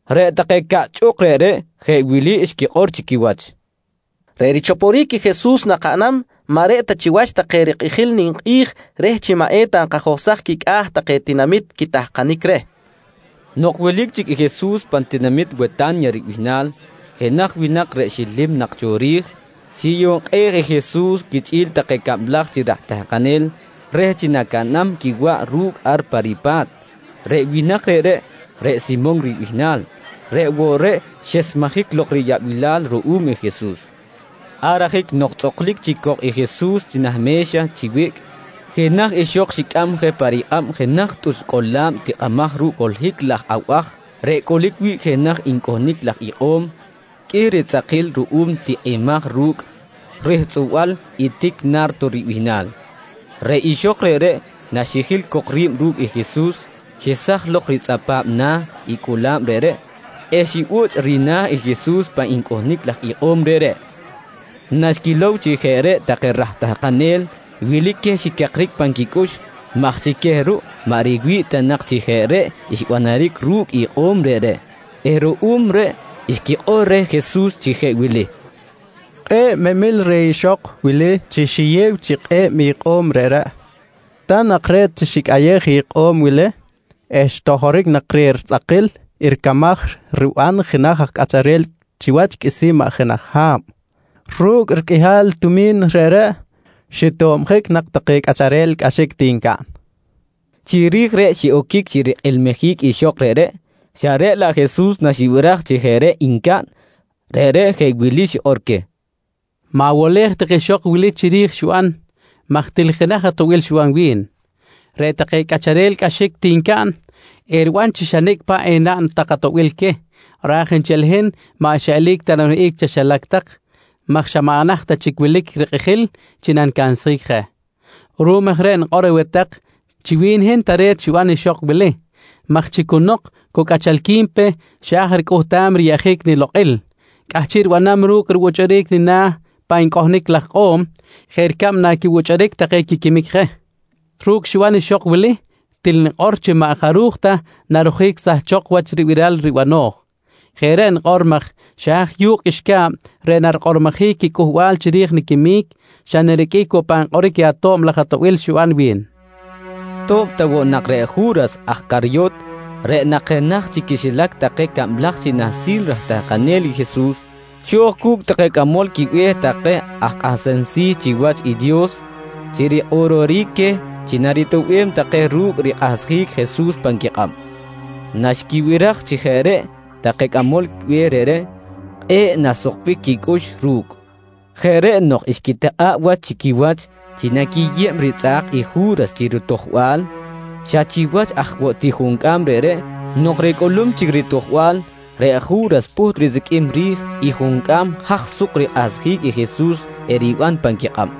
Reꞌ take caꞌchꞌuk reꞌreꞌ jeꞌ wili xquikꞌor chi quiwach: «Reꞌ richoporic i Jesus nakaꞌnam maꞌ reꞌ ta chiwach take rikꞌijil ninkꞌi̱j reh chi maꞌ eta nkajohsaj quicꞌa̱ take tinamit quitahkanic reh, nqui take. Nok wilic chic i Jesus pan tinamit Weta̱nya ribihnal, jenaj winak reꞌ xilim nak cho ri̱j, xiyukꞌej i Jesus quichꞌi̱l take cablaj chi raj tahkanel reh chi nacaꞌnam quiwaꞌ ru̱cꞌ ar pa ripa̱t. Reꞌ winak reꞌreꞌ, reꞌ Simon ribihnal, reꞌ woꞌ reꞌ xesmejic lok riyaꞌbilal ruꞌum i Jesus. Ar ajic nok tzꞌuklic chic cok i Jesus nah me̱xa chi wiꞌc, jenaj ixok xicꞌam je pa rikꞌab jenaj tꞌuch cꞌola̱b tikꞌimaj ru̱cꞌ holohic laj abaj reꞌ cꞌolic wi̱ꞌ jenaj ncꞌohnic laj ikꞌo̱m qꞌuih ritzꞌakil ruꞌum tikꞌimaj ru̱cꞌ rihtzꞌuba̱l i tic “Na̱rto” ribihnal. Reꞌ ixok reꞌreꞌ naxijil cok ri̱b ru̱cꞌ i Jesus, xesaj lok ritzꞌapa̱b na̱ i cꞌola̱b reꞌreꞌ eh xibuchꞌ rina̱ i Jesus pan ncꞌohnic laj ikꞌo̱m reꞌreꞌ. Naxquilow chi jeꞌ reꞌ take raj tahkanel, wilic queh xicakric pan quicꞌux maj chi queh ruꞌ maꞌ riwi̱ꞌ ta nak chi jeꞌ reꞌ xbanaric ru̱cꞌ ikꞌo̱m reꞌreꞌ eh ruꞌum reꞌ xquikꞌor reh Jesus chi jeꞌ wili: «Kꞌe̱ꞌ memil reh ixok wili chi xiyew chi kꞌe̱b ikꞌo̱m reꞌreꞌ. Ta nak re̱t chi xicꞌayej ikꞌo̱m wili eh xtojoric nak reh ritzꞌakil ricamaj riban jenaj cꞌacharel chiwach qꞌuisi̱n maꞌ jenaj ha̱b. Ru̱cꞌ riqꞌuihal tumi̱n reꞌreꞌ xitobjic nak take cꞌacharel cꞌaxic ti ncaꞌn, nqui take. Chiri̱j reꞌ xiꞌoquic chi rikꞌilmijic ixok reꞌreꞌ xa reꞌ laꞌ Jesus naxibiraj chi jeꞌ reꞌ ncaꞌn, reꞌreꞌ jeꞌ wili xikꞌor queh: «Ma̱wolej tak ixok wili chiri̱j i xiban maj til jenaj atoꞌbil xiban wi̱n. Reꞌ take cꞌacharel cꞌaxic ti ncaꞌn, eriban chi xa nicꞌ paꞌ enaꞌn tak atoꞌbil queh, raj nchel i hin maꞌ xa eli̱c ta naniwihꞌic chaxilac tak maj xa maꞌ naht ta chic wilic je rikꞌijil chi nanicansjic je. Ruꞌum aj reꞌ nikꞌor aweh tak chi wi̱n i hin tare̱t xiban ixok wili maj chi nok chi cu cꞌachalqui̱n pe, xa̱j ricꞌuhtam riyeꞌjic nilokꞌil cꞌahchiꞌ ribanam ru̱cꞌ ribuchꞌuric nina̱ pan ncꞌohnic laj ikꞌo̱m jeꞌ ricab naquibuchꞌuric take quiquimic je. Ru̱cꞌ xiban ixok wili, til nikꞌor chi maꞌ jaruj ta narojic sahchok wach ribiral ribano̱j. Jeꞌ reꞌ nikꞌor maj xa haj yu̱kꞌ qꞌuixca̱b reꞌ narikꞌormojic i cꞌuhbal chiri̱j niquimic, xa nariqꞌuic woꞌ pan kꞌoric i ato̱b laj atoꞌbil xiban wi̱n, nqui Jesus. To̱b ta woꞌ nak reꞌ Ju̱ras aj Caryot, reꞌ nak jenaj chi quixilac take cablaj chi nahsil raj tahkanel i Jesus, xo̱j cu̱cꞌ take cꞌamol quibe̱h take aj kꞌahsem si̱ chiwach i Dios chi rikꞌororic queh chi naritoꞌbem take ru̱cꞌ rikꞌahsjic Jesus pan quikꞌab. Naxquibiraj chi jeꞌ reꞌ take cꞌamol be̱h reꞌreꞌ, kꞌe̱ꞌ naxsukbic quicꞌux ru̱cꞌ. Jeꞌ reꞌ nok xquitikꞌa̱ꞌ wach chi quiwach chi naquiyeb ritzꞌa̱k i Ju̱ras chi ritojbal. Xa chiwach aj woꞌ ti juncꞌam reꞌreꞌ nok ricꞌulum chic ritojbal, reꞌ Ju̱ras pꞌuht risiqꞌuim ri̱j i juncꞌam haj suk rikꞌahsjic i Jesus eriban pan quikꞌab.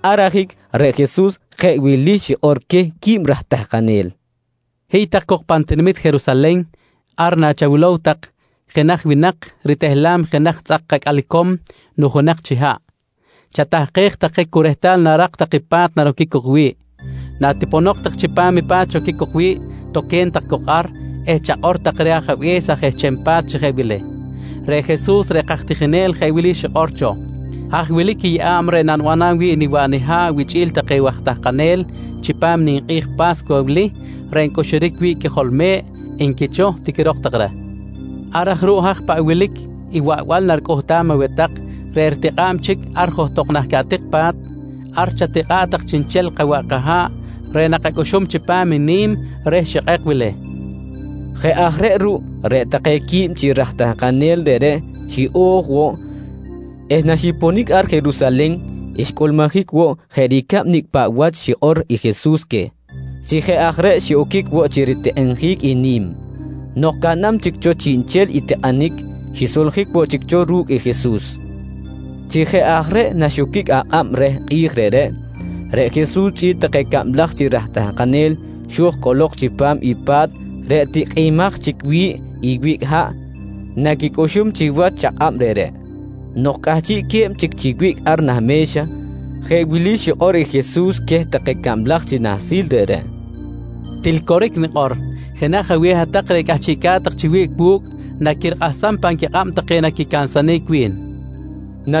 Ar ajic reꞌ Jesus jeꞌ wili xikꞌor queh quib raj tahkanel: «Hiy tak cok pan tinamit Jerusalen. Ar nachawilow tak i jenaj winak ritehlam jenaj tzꞌak acꞌal icom nujunak chi haꞌ, chatahkej tak je cu rehtal narak tak i pa̱t naroquic cok wi̱ꞌ. Natiponok tak chipam i pa̱t xoquic cok wi̱ꞌ, toque̱n tak cok ar eh chakꞌor tak reh ajabe̱s aj ehcham pa̱t chi jeꞌ wili: ‹Reꞌ Jesus reꞌ kaj tijinel jeꞌ wili xikꞌor cho: Haj wilic i yeꞌa̱b reꞌ nanibanam wi̱ꞌ niwaꞌ niha̱ꞌ wichꞌi̱l take waj tahkanel chipam i ninkꞌi̱j Pa̱scuwa wili reꞌ ncꞌuxuric wi̱ꞌ i qꞌuijol me̱ꞌ, nqui cho, tiquirok tak reh. «Ar aj ruꞌ haj paꞌ wilic i waꞌbal naricꞌuhtam aweh tak reꞌ ritikꞌa̱b chic ar johtok nah caꞌtik pa̱t, ar chatikꞌa̱ꞌ tak chiꞌnchel kawaꞌ kaha̱ꞌ reꞌ nakacꞌuxum chipam i ni̱m reh xikꞌek wili, nqui Jesus queh. Jeꞌ aj reꞌ ruꞌ, reꞌ take quib chi raj tahkanel reꞌreꞌ xiꞌo̱j woꞌ eh naxiponic ar Jerusalen xcꞌulmujic woꞌ jeꞌ ricab nicꞌ paꞌ wach xikꞌor i Jesus queh. Chi jeꞌ aj reꞌ xiꞌoquic woꞌ chi ritikꞌinjic i ni̱m. Nok caꞌnam chic cho chiꞌnchel tikꞌinic, xisoljic woꞌ chic cho ru̱cꞌ i Jesus. Chi jeꞌ aj reꞌ naxoquic akꞌab reh kꞌi̱j reꞌreꞌ, reꞌ Jesus chꞌi̱l take cablaj chi raj tahkanel xo̱j cꞌolok chipam i pa̱t reꞌ tikꞌimaj chic wi̱ꞌ i wiꞌc haꞌ naquicꞌuxum chiwach i chakꞌab reꞌreꞌ. Nok cꞌahchiꞌque̱b chic chi wiꞌc ar nah me̱xa, jeꞌ wili xikꞌor i Jesus queh take cablaj chi nahsil reꞌreꞌ: «Til coric nikꞌor, jenaj aweh hat-tak reꞌ cꞌahchiꞌca̱t tak chi wiꞌc wu̱cꞌ, naquirikꞌahsam pan quikꞌab take naquicansanic wi̱n, nqui xikꞌor queh.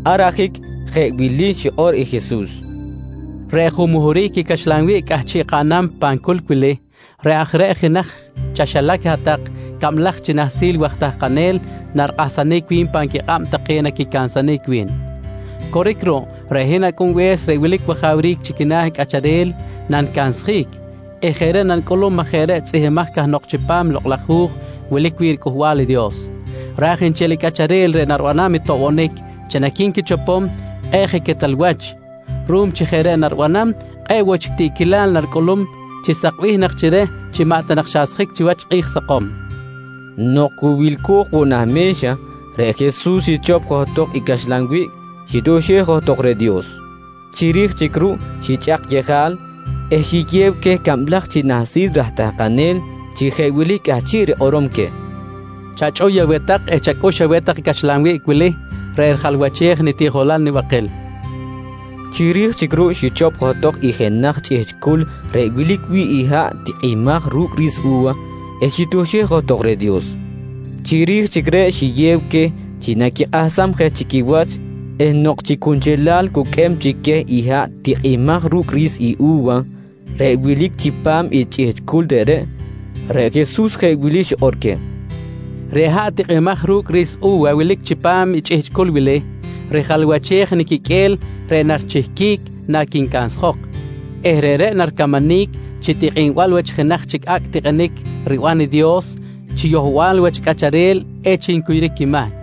Ar ajic jeꞌ wili xikꞌor i Jesus: «Reꞌ junmuhuric i caxlan wiꞌc cꞌahchiꞌ kaꞌnam pan culc wili, reꞌ aj reꞌ i jenaj chaxilac i hat-tak cablaj chi nahsil waj tahkanel, narikꞌahsanic wi̱n pan quikꞌab take naquicansanic wi̱n. Coric ruꞌ, reꞌ hin Acꞌunbe̱s reꞌ wilic wajawric chi quina̱ cꞌacharel nanicansjic eh jeꞌ reꞌ nanicꞌulum maj jeꞌ reꞌ tzꞌihmbimaj cahnok chipam i Lokꞌ laj Hu̱j wilic wi̱ꞌ riCꞌuhbal i Dios, raj nchel i cꞌacharel reꞌ naribanam i toꞌbonic chi naqui̱nquichopom, kꞌe̱ꞌ je quetal wach. Ruꞌum chi jeꞌ reꞌ naribanam, kꞌe̱ꞌ woꞌ chic tiꞌquilal naricꞌulum chi sakbih nak chi reh chi maꞌ ta nak xasjic chiwach kꞌi̱j sakom, nqui Jesus. Nok cu wilco̱j woꞌ nah me̱xa, reꞌ Jesus xichop johtok i caxlan wiꞌc, xitioxej johtok reh Dios. Chiri̱j chic ruꞌ xichꞌak yejal eh xiyew queh cablaj chi nahsil raj tahkanel chi jeꞌ wili cꞌahchiꞌ rikꞌorom queh: «Chachꞌuy aweh tak eh chacꞌux aweh tak i caxlan wiꞌc wili reꞌ rijalwachej i nitiꞌjolal nibakil, nqui queh. Chiri̱j chic ruꞌ xichop johtok i jenaj chꞌihchꞌ culc reꞌ wilic wi̱ꞌ i haꞌ tikꞌimaj ru̱cꞌ ri̱s u̱wa eh xitioxej johtok reh Dios. Chiri̱j chic reꞌ xiyew queh chi naquikꞌahsam je chi quiwach eh nok chi cunchelal cuqꞌuem chic queh i haꞌ tikꞌimaj ru̱cꞌ ri̱s u̱wa reꞌ wilic chipam i chꞌihchꞌ culc reꞌreꞌ, reꞌ Jesus jeꞌ wili xikꞌor queh: «Reꞌ haꞌ tikꞌimaj ru̱cꞌ ri̱s u̱wa wilic chipam i chꞌihchꞌ culc wili, rijalwachej i niquiqꞌue̱l reꞌ narichihquic naquincansjok eh reꞌreꞌ naricamanic chi tikꞌinbal wach i jenaj chic acꞌ tikꞌinic riban i Dios chi yohbal wach cꞌacharel echic ncuyuric quimahc.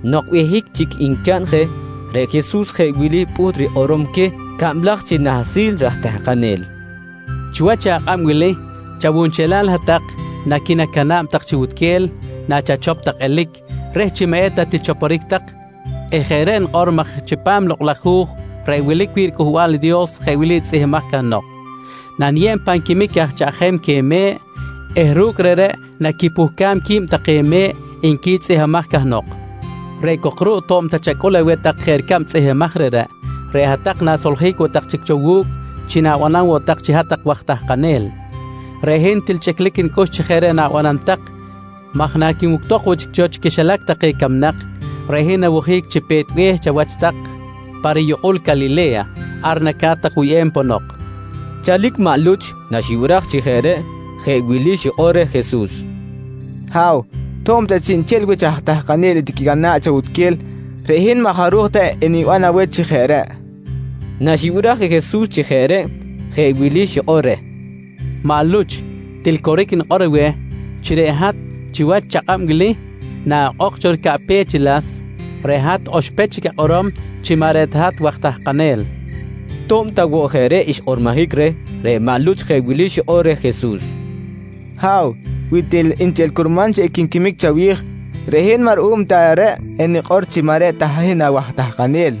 Nok behic chic ncaꞌn je, reꞌ Jesus jeꞌ wili pꞌuht rikꞌorom queh cablaj chi nahsil raj tahkanel: «Chiwach akꞌab wili chawunchelal hat-tak naquinacana̱b tak chi wutquel nachachop tak elic reh chi maꞌ eta tichoporic tak eh jeꞌ reꞌ nikꞌor maj chipam i Lokꞌ laj Hu̱j reꞌ wilic wi̱ꞌ riCꞌuhbal i Dios jeꞌ wili tzꞌihmbimaj cahnok: “Naniyeb pan quimic aj chaꞌjem queh me̱ꞌ eh ru̱cꞌ reꞌreꞌ naquipuhcam qui̱b take me̱ꞌ, nqui tzꞌihmbimaj cahnok. «Reꞌ cok ruꞌ, to̱b ta chacꞌul aweh tak jeꞌ ricab tzꞌihmbimaj reꞌreꞌ, reꞌ hat-tak na̱soljic woꞌ tak chic cho wu̱cꞌ chi na̱banam woꞌ tak chic chi hat-tak waj tahkanel. Reꞌ hin til chꞌiclic nicꞌux chi jeꞌ reꞌ na̱banam tak maj naquinuctok woꞌ chic cho chi quixilac take camnak, reꞌ hin nawojic chi pe̱t be̱h chawach tak pa riyukꞌul Calile̱ya. Ar naca̱t tak wuyꞌem ponok, nqui Jesus queh. Chalic maꞌ Luch naxibiraj chi jeꞌ reꞌ, jeꞌ wili xikꞌor reh Jesus: «Ha̱w, to̱b ta chiꞌnchel wich aj tahkanel etiquicana̱ꞌ chawutquel, reꞌ hin maꞌ jaruj ta eniban aweh chi jeꞌ reꞌ, nqui reh. Naxibiraj i Jesus chi jeꞌ reꞌ, jeꞌ wili xikꞌor reh: «Maꞌ Luch, til coric nikꞌor chi reꞌ hat chiwach i chakꞌab wili naꞌokꞌok cho ricaꞌpech i las, reꞌ hat oxpech chic akꞌorom chi maꞌ reꞌ ta hat waj tahkanel, nqui reh. To̱b ta woꞌ jeꞌ reꞌ xkꞌormojic reh, reꞌ maꞌ Luch jeꞌ wili xikꞌor reh Jesus: «Ha̱w, wi til nchel curman chi equinquimic chawi̱j, reꞌ hin maꞌ ruꞌum ta reꞌ enikꞌor chi maꞌ reꞌ ta hin awaj tahkanel, nqui maꞌ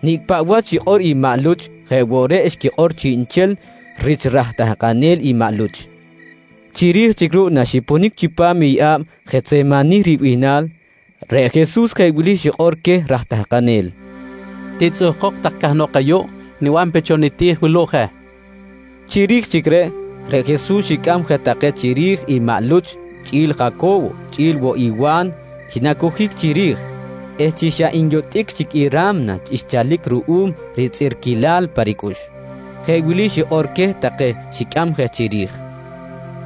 Luch. Nicꞌ paꞌ wach xikꞌor i maꞌ Luch, jeꞌ woꞌ reꞌ xquikꞌor chiꞌnchel rich aj tahkanel i maꞌ Luch. Chiri̱j chic ruꞌ naxiponic chipam i yeꞌa̱b Jetsemanih ribihnal, reꞌ Jesus jeꞌ wili xikꞌor queh raj tahkanel: «Titzꞌuhkok tak cahnok ayuꞌ, niban pe cho niti̱j wuluꞌ je, nqui queh. Chiri̱j chic reꞌ, reꞌ Jesus xicꞌam je take chiri̱j i maꞌ Luch, chꞌi̱l Jaco̱wo chꞌi̱l woꞌ i Wa̱n chi nacojic chiri̱j eh chi xa nyotꞌic chic i ra̱mna xchalic ruꞌum ritzꞌirquilal pa ricꞌux, jeꞌ wili xikꞌor queh take xicꞌam je chiri̱j: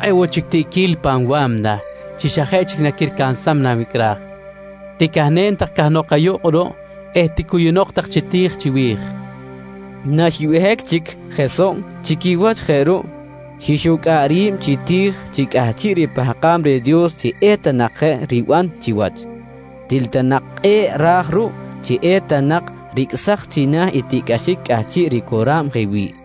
«Kꞌe̱ꞌ woꞌ chic tiꞌquil pan wa̱mna chi xa jeꞌ chic naquiricansam nanwicꞌraj. Ticahnen tak cahnok ayuꞌ kꞌuruꞌ eh ticuyunok tak chi ti̱j chiwi̱j, nqui queh. Naxbehic chic je soꞌ chi quiwach je ruꞌ, xixucꞌa̱ꞌ ri̱b chi ti̱j chi cꞌahchiꞌ ripahkam reh Dios chi eta nak je riban chiwach, til nak kꞌe̱ꞌ ra̱j ruꞌ chi eta nak ricꞌsaj china̱ i tiꞌcꞌaxic cꞌahchiꞌ ricora̱b je wi̱ꞌ.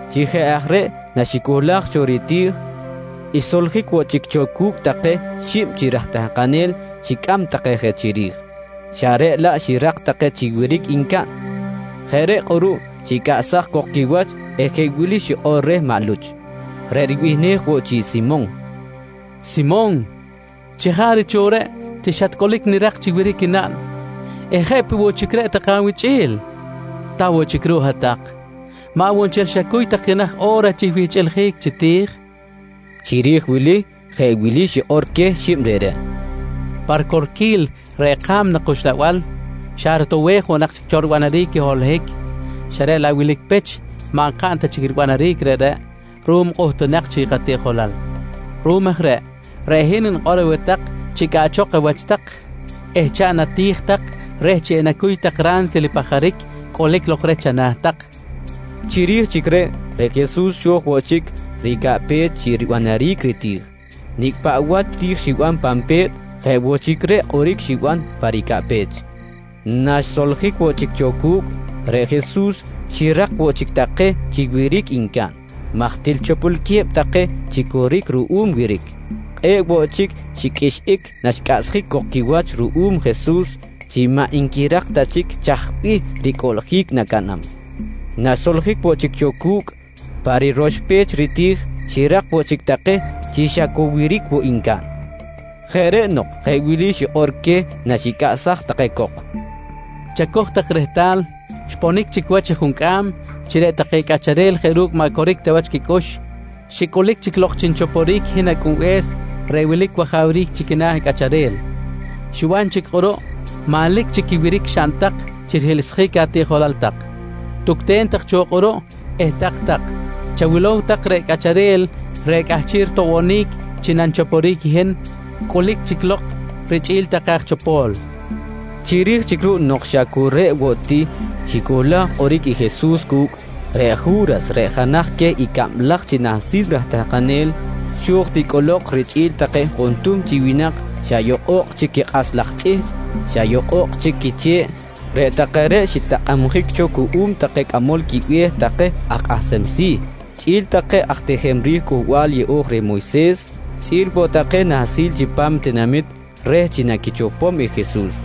Chi jeꞌ aj reꞌ naxicohlaj cho riti̱j, xsoljic woꞌ chic cho cu̱cꞌ take xib chi raj tahkanel xicꞌam take je chiri̱j, xa reꞌ laꞌ xirak take chi wiric ncaꞌn. Jeꞌ reꞌ kꞌuruꞌ xicꞌaꞌchsaj cok quiwach eh jeꞌ wili xikꞌor reh maꞌ Luch reꞌ ribihnej woꞌ chi Simon: «Simon, chajaric cho reꞌ chi xatcꞌulic nirak chi wiric naꞌn eh jeꞌ peꞌ woꞌ chic reꞌ take awichꞌi̱l? Ta woꞌ chic ruꞌ i hat-tak, maꞌ woꞌ nchel xacuy tak jenaj o̱ra chi wihchꞌiljic chi ti̱j? nqui reh. Chiri̱j wili jeꞌ wili xikꞌor queh xib reꞌreꞌ: «Pa ricorquil reꞌ ka̱mna kuxlabal xa rotowej woꞌ nak cho ribanaric i holohic xa reꞌ laꞌ wilic pech maꞌ nkaꞌn ta chic ribanaric reꞌreꞌ ruꞌum kꞌuhtunak chic katiꞌjolal. Ruꞌum aj reꞌ, reꞌ hin nikꞌor aweh tak chi cꞌaꞌchok awach tak eh chaꞌn ati̱j tak reh chi enacuy tak ransil i pajaric cꞌulic lok reh chana̱ tak, nqui queh. Chiri̱j chic reꞌ, reꞌ Jesus xo̱j woꞌ chic ricaꞌpech chi ribanaric riti̱j. Nicꞌ paꞌ wach ti̱j xiban pan pe̱t, jeꞌ woꞌ chic reꞌ kꞌoric xiban pa ricaꞌpech. Naxsoljic woꞌ chic cho cu̱cꞌ, reꞌ Jesus xirak woꞌ chic take chi wiric ncaꞌn maj til chopolque̱b take chi coric ruꞌum wiric. Kꞌe̱ꞌ woꞌ chic xiqꞌuixꞌic naxcꞌachsjic cok quiwach ruꞌum Jesus chi maꞌ nquirak ta chic chaj bih ricꞌuꞌljic nacaꞌnam. Naxsoljic woꞌ chic cho cu̱cꞌ pa roxpech riti̱j, xirak woꞌ chic take chi xa cu wiric woꞌ ncaꞌn. Jeꞌ reꞌ nok jeꞌ wili xikꞌor queh naxicꞌaꞌsaj take cok: «Chacoj tak rehtal, xponic chic wach i juncꞌam chi reꞌ take cꞌacharel jeꞌ ru̱cꞌ maꞌ coric ta wach quicꞌux, xicꞌulic lok chi nichoporic i hin Acꞌunbe̱s reꞌ wilic wajawric chi quina̱ cꞌacharel. Xiban chic kꞌuruꞌ manlic chic i wiric xaꞌn tak chi rihiꞌlsjic atiꞌjolal tak. Tucten tak cho kꞌuruꞌ eh tak-tak. Chawilow tak, reꞌ cꞌacharel reꞌ cꞌahchiꞌ ritoꞌbonic chi nanichoporic i hin, cꞌulic chic lok richꞌi̱l take aj chopo̱l, nqui queh. Chiri̱j chic ruꞌ nok xa cu reꞌ woꞌ ti xicohlaj kꞌoric i Jesus cu̱cꞌ, reꞌ Ju̱ras reꞌ jenaj queh i cablaj chi nahsil raj tahkanel, xo̱j ti cꞌolok richꞌi̱l take juntuhm chi winak xa yokꞌo̱kꞌ chic quikꞌas laj chꞌihchꞌ, xa yokꞌo̱kꞌ chic quiche̱ꞌ. Reꞌ take reꞌ xitakꞌabjic cho cuꞌum take cꞌamol quibe̱h take aj kꞌahsem si̱, chꞌi̱l take aj tijem ri̱j Cꞌuhbal Yeꞌo̱j reh Moyses chꞌi̱l woꞌ take nahsil chipam tinamit reh chi naquichopom i Jesus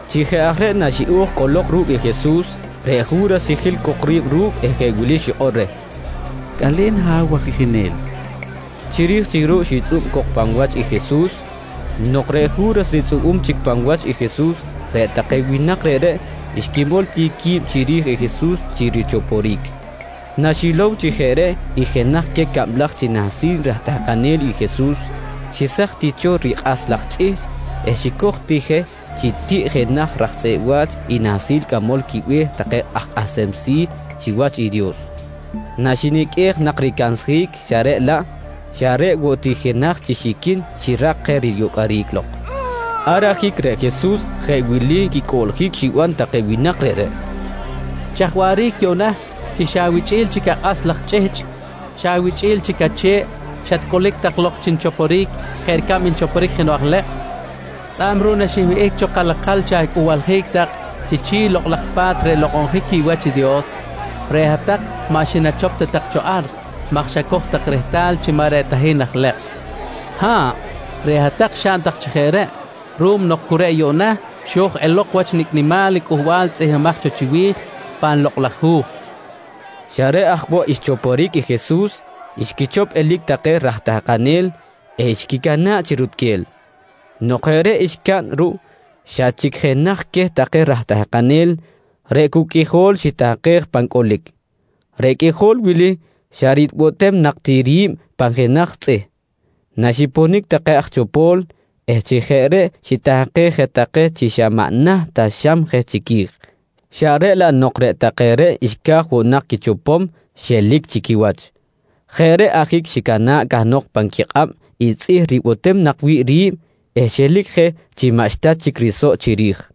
Chi jeꞌ aj reꞌ naxiꞌo̱j cꞌolok ru̱cꞌ i Jesus, reꞌ Ju̱ras xijil cok ri̱b ru̱cꞌ eh jeꞌ wili xikꞌor reh: «Cꞌale̱n Ha̱w waj tijinel, nqui reh. Chiri̱j chic ruꞌ xitzꞌub cok pan wach i Jesus. Nok reꞌ Ju̱ras ritzꞌubum chic pan wach i Jesus reꞌ take winak reꞌreꞌ xquimol ti qui̱b chiri̱j i Jesus chi richoporic. Naxilow chi jeꞌ reꞌ i jenaj queh cablaj chi nahsil raj tahkanel i Jesus, xehsaj ti cho rikꞌas laj chꞌihchꞌ eh xicoj ti je chi tiꞌ jenaj raj tzꞌeꞌ wa̱ch i nahsil cꞌamol quibe̱h take aj kꞌahsem si̱ chiwach i Dios, naxiniqꞌuej nak ricansjic xa reꞌ laꞌ, xa reꞌ woꞌ ti i jenaj chi xiquin xirak je riyocꞌoric lok. Ar ajic reꞌ Jesus jeꞌ wili quicꞌuꞌljic xiban take winak reꞌreꞌ: «Chaj waꞌric yuꞌna chi xa awichꞌi̱l chic akꞌas laj chꞌihchꞌ, xa awichꞌi̱l chic ache̱ꞌ, xatcꞌulic tak lok chi nichoporic jeꞌ ricab nanchoporic jenoꞌ aj lekꞌ? Tzꞌa̱b ruꞌ naxinwihꞌic cho kalakal chi acꞌuhbaljic tak chi chi̱ꞌ i Lokꞌ laj Pa̱t reꞌ nlokꞌonjic wi̱ꞌ wach i Dios, reꞌ hat-tak maꞌ xinachop ta tak cho ar maj xacoj tak rehtal chi maꞌ reꞌ ta hin aj ilekꞌ. Ha̱ꞌ, reꞌ hat-tak xaꞌn tak chi jeꞌ reꞌ ruꞌum nok cu reꞌ yuꞌna xo̱j elok wach nicꞌ nimal i cꞌuhbal tzꞌihmbimaj cho chiwi̱j pan Lokꞌ laj Hu̱j, nqui queh. Xa reꞌ aj woꞌ xchoporic i Jesus, xquichop elic take raj tahkanel eh xquicana̱ꞌ chi rutquel. Nok jeꞌ reꞌ xcaꞌn ruꞌ, xa chic jenaj queh take raj tahkanel reꞌ cu qꞌuijol xitahkej pan cꞌolic. Reꞌ qꞌuijol wili xa ribotem nak ti ri̱b pan jenaj tzꞌih naxiponic take aj chopo̱l eh chi jeꞌ reꞌ xitahkej je take chi xa maꞌ naht ta xam je chiqui̱j, xa reꞌ laꞌ nok reꞌ take reꞌ xca̱j woꞌ nak quichopom xelic chi quiwach. Jeꞌ reꞌ ajic xicana̱ꞌ cahnok pan quikꞌab i tzꞌih ribotem nak wi̱ꞌ ri̱b eh xelic je chi maꞌxta chic risoꞌ chiri̱j.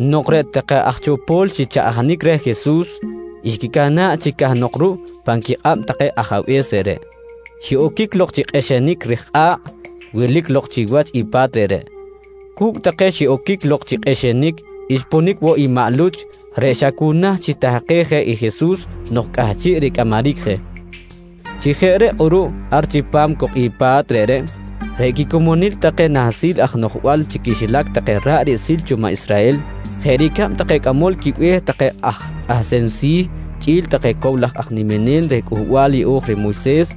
Nok reꞌ take aj chopo̱l xichaꞌjanic reh i Jesus, xquicana̱ꞌ chic cahnok ruꞌ pan quikꞌab take ajabe̱s reꞌreꞌ, xiꞌoquic lok chi kꞌixinic ri̱j kꞌa̱kꞌ wilic lok chiwach i pa̱t reꞌreꞌ. Cu̱cꞌ take xiꞌoquic lok chi kꞌixinic, xponic woꞌ i maꞌ Luch reꞌ xa cu naht xitahkej je i Jesus nok cꞌahchiꞌ ricꞌamaric je. Chi jeꞌ reꞌ kꞌuruꞌ ar chipam cok i pa̱t reꞌreꞌ, reꞌ quicomonil take nahsil aj noꞌjbal chi quixilac take ra̱ꞌ riꞌsil cho maꞌ Israhel jeꞌ ricab take cꞌamol quibe̱h take aj kꞌahsem si̱ chꞌi̱l take cow laj aj niminel reh Cꞌuhbal Yeꞌo̱j reh Moyses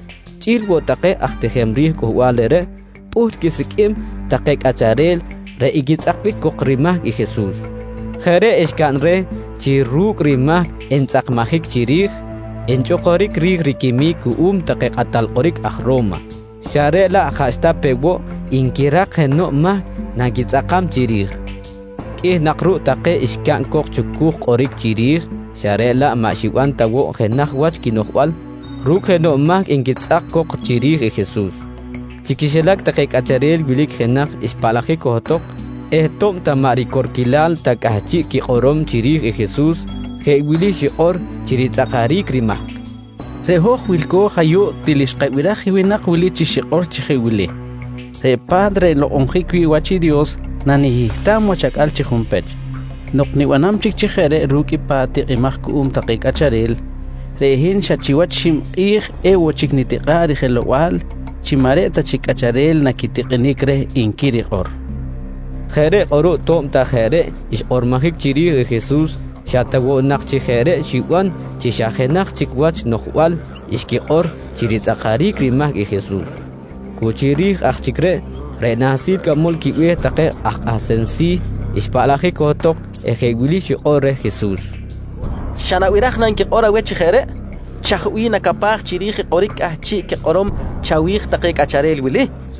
chꞌi̱l woꞌ take aj tijem ri̱j cꞌuhbal reꞌreꞌ, pꞌuht quisiqꞌuim take cꞌacharel reꞌ equitzꞌakbic cok rimahc i Jesus. Jeꞌ reꞌ xcaꞌn reh chi ru̱cꞌ rimahc entzꞌakmajic chiri̱j, enchꞌukuric ri̱j riquimic cuꞌum take kꞌatal kꞌoric aj Ro̱ma xa reꞌ laꞌ jaꞌxta pe woꞌ nquirak jenoꞌ mahc naquitzꞌakam chiri̱j. Qꞌuih nak ruꞌ take xcaꞌn cok chucuj kꞌoric chiri̱j xa reꞌ laꞌ maꞌ xiban ta woꞌ jenaj wach quinoꞌjbal ru̱cꞌ jenoꞌ mahc nquitzꞌak cok chiri̱j i Jesus. Chi quixilac take cꞌacharel wilic i jenaj xpaꞌlajic johtok eh to̱b ta maꞌ ricorquilal ta cꞌahchiꞌ quikꞌorom chiri̱j i Jesus, jeꞌ wili xikꞌor chi ritzꞌakaric rimahc: «Reꞌ hoj wilco̱j ayuꞌ til xkabiraj i winak wili chi xikꞌor chi jeꞌ wili: ‹Reꞌ pa̱t reꞌ nlokꞌonjic wi̱ꞌ wach i Dios nanihihtam wach acꞌal chi junpech. Nok nibanam chic chi jeꞌ reꞌ ru̱cꞌ i pa̱t tikꞌimaj cuꞌum take cꞌacharel, reꞌ hin xa chiwach xib kꞌi̱j ewoꞌ chic enitikꞌa̱ꞌ rijelow-bal chi maꞌ reꞌ ta chic cꞌacharel naquitikꞌinic reh, nqui rikꞌor, nqui cok. Jeꞌ reꞌ kꞌuruꞌ to̱b ta jeꞌ reꞌ xkꞌormojic chiri̱j i Jesus xa ta woꞌ nak chi jeꞌ reꞌ xiban chi xa jenaj chic wach noꞌjbal xquikꞌor chi ritzꞌakaric rimahc i Jesus. Cu chiri̱j aj chic reꞌ, reꞌ nahsil cꞌamol quibe̱h take aj kꞌahsem si̱ xpaꞌlajic johtok eh jeꞌ wili xikꞌor reh i Jesus: «Xa nabiraj na nquikꞌor aweh chi jeꞌ reꞌ? Chaj bih nacapaj chiri̱j i kꞌoric cꞌahchiꞌ quikꞌorom chawi̱j take cꞌacharel wili? nqui reh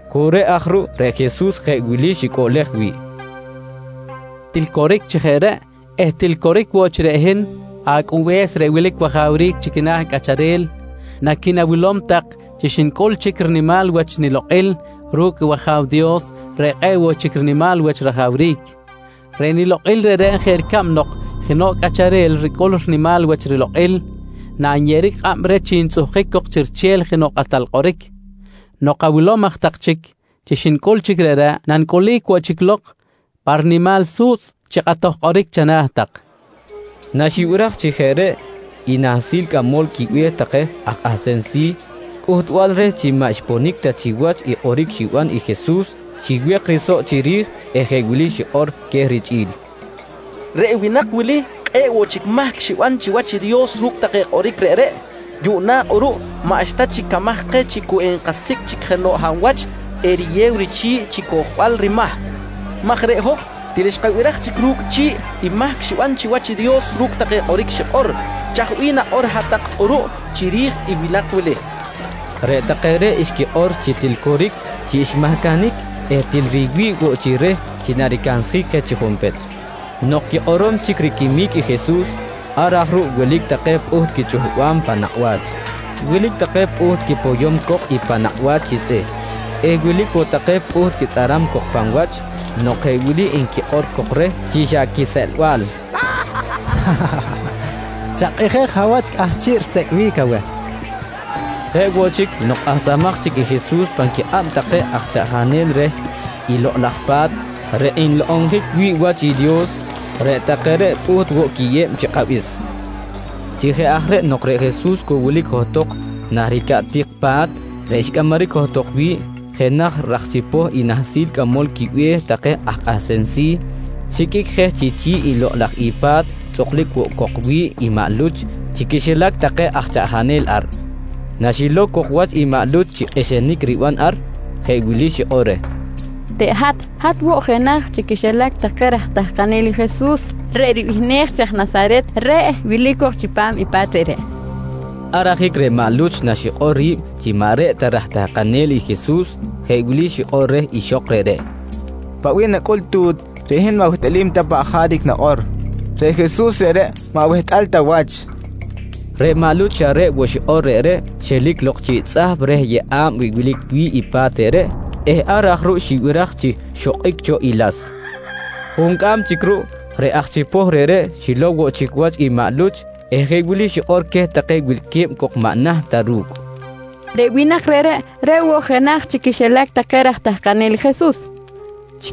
Cu reꞌ aj ruꞌ reꞌ Jesus jeꞌ wili xicꞌuꞌlej wi̱ꞌ: «Til coric chi jeꞌ reꞌ eh til coric woꞌ chi reꞌ hin Acꞌunbe̱s reꞌ wilic wajawric chi quina̱ cꞌacharel, naqui̱nawilom tak chi xnicꞌul chic rinimal wach nilokꞌil ru̱cꞌ i wAja̱w Dios reꞌ kꞌe̱ꞌ woꞌ chic rinimal wach rajawric. Reꞌ nilokꞌil reꞌreꞌ jeꞌ ricab nok jenoꞌ cꞌacharel ricꞌul rinimal wach rilokꞌil nanyeꞌeric kꞌab reh chi ntzꞌuhkic cok chi riche̱l jenoꞌ kꞌatal kꞌoric. Nok awilom aj tak chic chi xnicꞌul chic reꞌreꞌ, nanicꞌulic woꞌ chic lok pa rinimal su̱tzꞌ chi kꞌatoj kꞌoric chana̱ tak, nqui queh. Naxibiraj chi jeꞌ reꞌ i nahsil cꞌamol quibe̱h take aj kꞌahsem si̱, cꞌuhtbal reh chi maꞌ xponic ta chiwach i kꞌoric xiban i Jesus xiwek i risoꞌ chiri̱j eh jeꞌ wili xikꞌor queh richꞌi̱l: «Reꞌ winak wili kꞌe̱ꞌ woꞌ chic mahc xiban chiwach i Dios ru̱cꞌ take kꞌoric reꞌreꞌ. Yuꞌna kꞌuruꞌ maꞌxta chic camaj keh chi cu enkasicꞌ chic jenoꞌ hab wach eriyew richi̱ꞌ chi cojbal rimahc maj reꞌ hoj til xkabiraj chic ru̱cꞌ chi̱ꞌ i mahc xiban chiwach i Dios ru̱cꞌ take kꞌoric xikꞌor. Chaj bih nakꞌor hat-tak kꞌuruꞌ chiri̱j i winak wili? nqui queh. Reꞌ take reꞌ xquikꞌor chi til coric chi xmahcanic eh til riwi̱ꞌ woꞌ chi reh chi naricansjic je chi junpech. Nok quikꞌorom chic riquimic i Jesus, ar aj ruꞌ wilic take pꞌuht quichuhbam pan nakꞌ wach, wilic take pꞌuht quipoyom cok i pan nakꞌ wach chi tzꞌih eh wilic woꞌ take pꞌuht quitzꞌaram cok pan wach nok jeꞌ wili nquikꞌor cok reh chi xa quiseꞌlbal: «Chakꞌijej, hab wach cꞌahchiꞌ risecꞌbic aweh? nqui nquikꞌor reh. Jeꞌ woꞌ chic, nok kꞌahsamaj chic i Jesus pan quikꞌab take aj chaꞌjanel reh i Lokꞌ laj Pa̱t reꞌ nlokꞌonjic wi̱ꞌ wach i Dios, reꞌ take reꞌ pꞌuht woꞌ quiyeb chi kꞌabis. Chi jeꞌ aj reꞌ nok reꞌ Jesus cu wilic johtok nah ricaꞌtik pa̱t reꞌ xcꞌamaric johtok wi̱ꞌ, jenaj raj chipoh i nahsil cꞌamol quibe̱h take aj kꞌahsem si̱ xiqꞌuic je chi chi̱ꞌ lok i pa̱t tzꞌuklic woꞌ cok wi̱ꞌ i maꞌ Luch chi quixilac take aj chaꞌjanel ar. Naxilow cok wach i maꞌ Luch chi kꞌixinic riban ar, jeꞌ wili xikꞌor reh: «Reꞌ hat, hat woꞌ jenaj chi quixilac take raj tahkanel i Jesus reꞌ ribihnej chi aj Nasaret, reꞌ wilic cok chipam i pa̱t reꞌreꞌ, nqui reh. Ar ajic reꞌ maꞌ Luch naxikꞌor ri̱b chi maꞌ reꞌ ta raj tahkanel i Jesus, jeꞌ wili xikꞌor reh ixok reꞌreꞌ: «Paꞌ bih nacꞌul tu̱t! Reꞌ hin maꞌ wehtꞌalim ta paꞌ jaric nakꞌor. Reꞌ Jesus reꞌreꞌ maꞌ wehtꞌal ta wach, nqui reh. Reꞌ maꞌ Luch xa reꞌ woꞌ xikꞌor reꞌreꞌ xelic lok chiꞌ tzꞌahp reh yeꞌa̱b wilic wi̱ꞌ i pa̱t reꞌreꞌ eh ar aj ruꞌ xibiraj chi xokꞌic cho i las. Juncꞌam chic ruꞌ, reꞌ aj chipoh reꞌreꞌ xilow woꞌ chic wach i maꞌ Luch eh jeꞌ wili xikꞌor queh take wilque̱b cok maꞌ naht ta ru̱cꞌ: «Reꞌ winak reꞌreꞌ, reꞌ woꞌ jenaj chi quixilac take raj tahkanel i Jesus, nqui queh.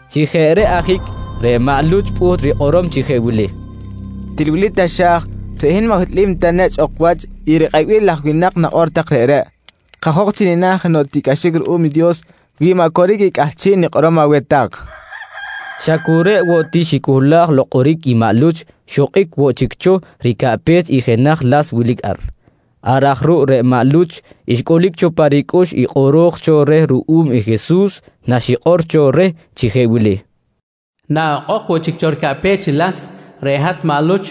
Chi jeꞌ reꞌ ajic reꞌ maꞌ Luch pꞌuht rikꞌorom chi jeꞌ wili: «Til wili taxa̱j, reꞌ hin maꞌ wehtꞌalim ta nechꞌ ok wach i rikꞌebil laj winak nakꞌor tak reꞌreꞌ. Kajok chi nina̱ jenoꞌ tiꞌcꞌaxic ruꞌum i Dios wi maꞌ coric i cꞌahchiꞌ nikꞌorom aweh tak, nqui queh. Xa cu reꞌ woꞌ ti xicohlaj kꞌoric i maꞌ Luch, xokꞌic woꞌ chic cho ricaꞌpech i jenaj las wilic ar. Ar aj ruꞌ reꞌ maꞌ Luch xcꞌulic cho pa ricꞌux i kꞌoro̱j cho reh ruꞌum i Jesus naxikꞌor cho reh chi jeꞌ wili: «Naꞌokꞌok woꞌ chic cho ricaꞌpech i las, reꞌ hat maꞌ Luch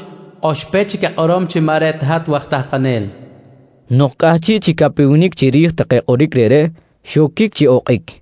oxpech chic akꞌorom chi maꞌ reꞌ ta hat waj tahkanel, nqui kꞌoro̱j cho reh. Nok cꞌahchiꞌ chi capewenic chiri̱j take kꞌoric reꞌreꞌ, xoquic chi okꞌic.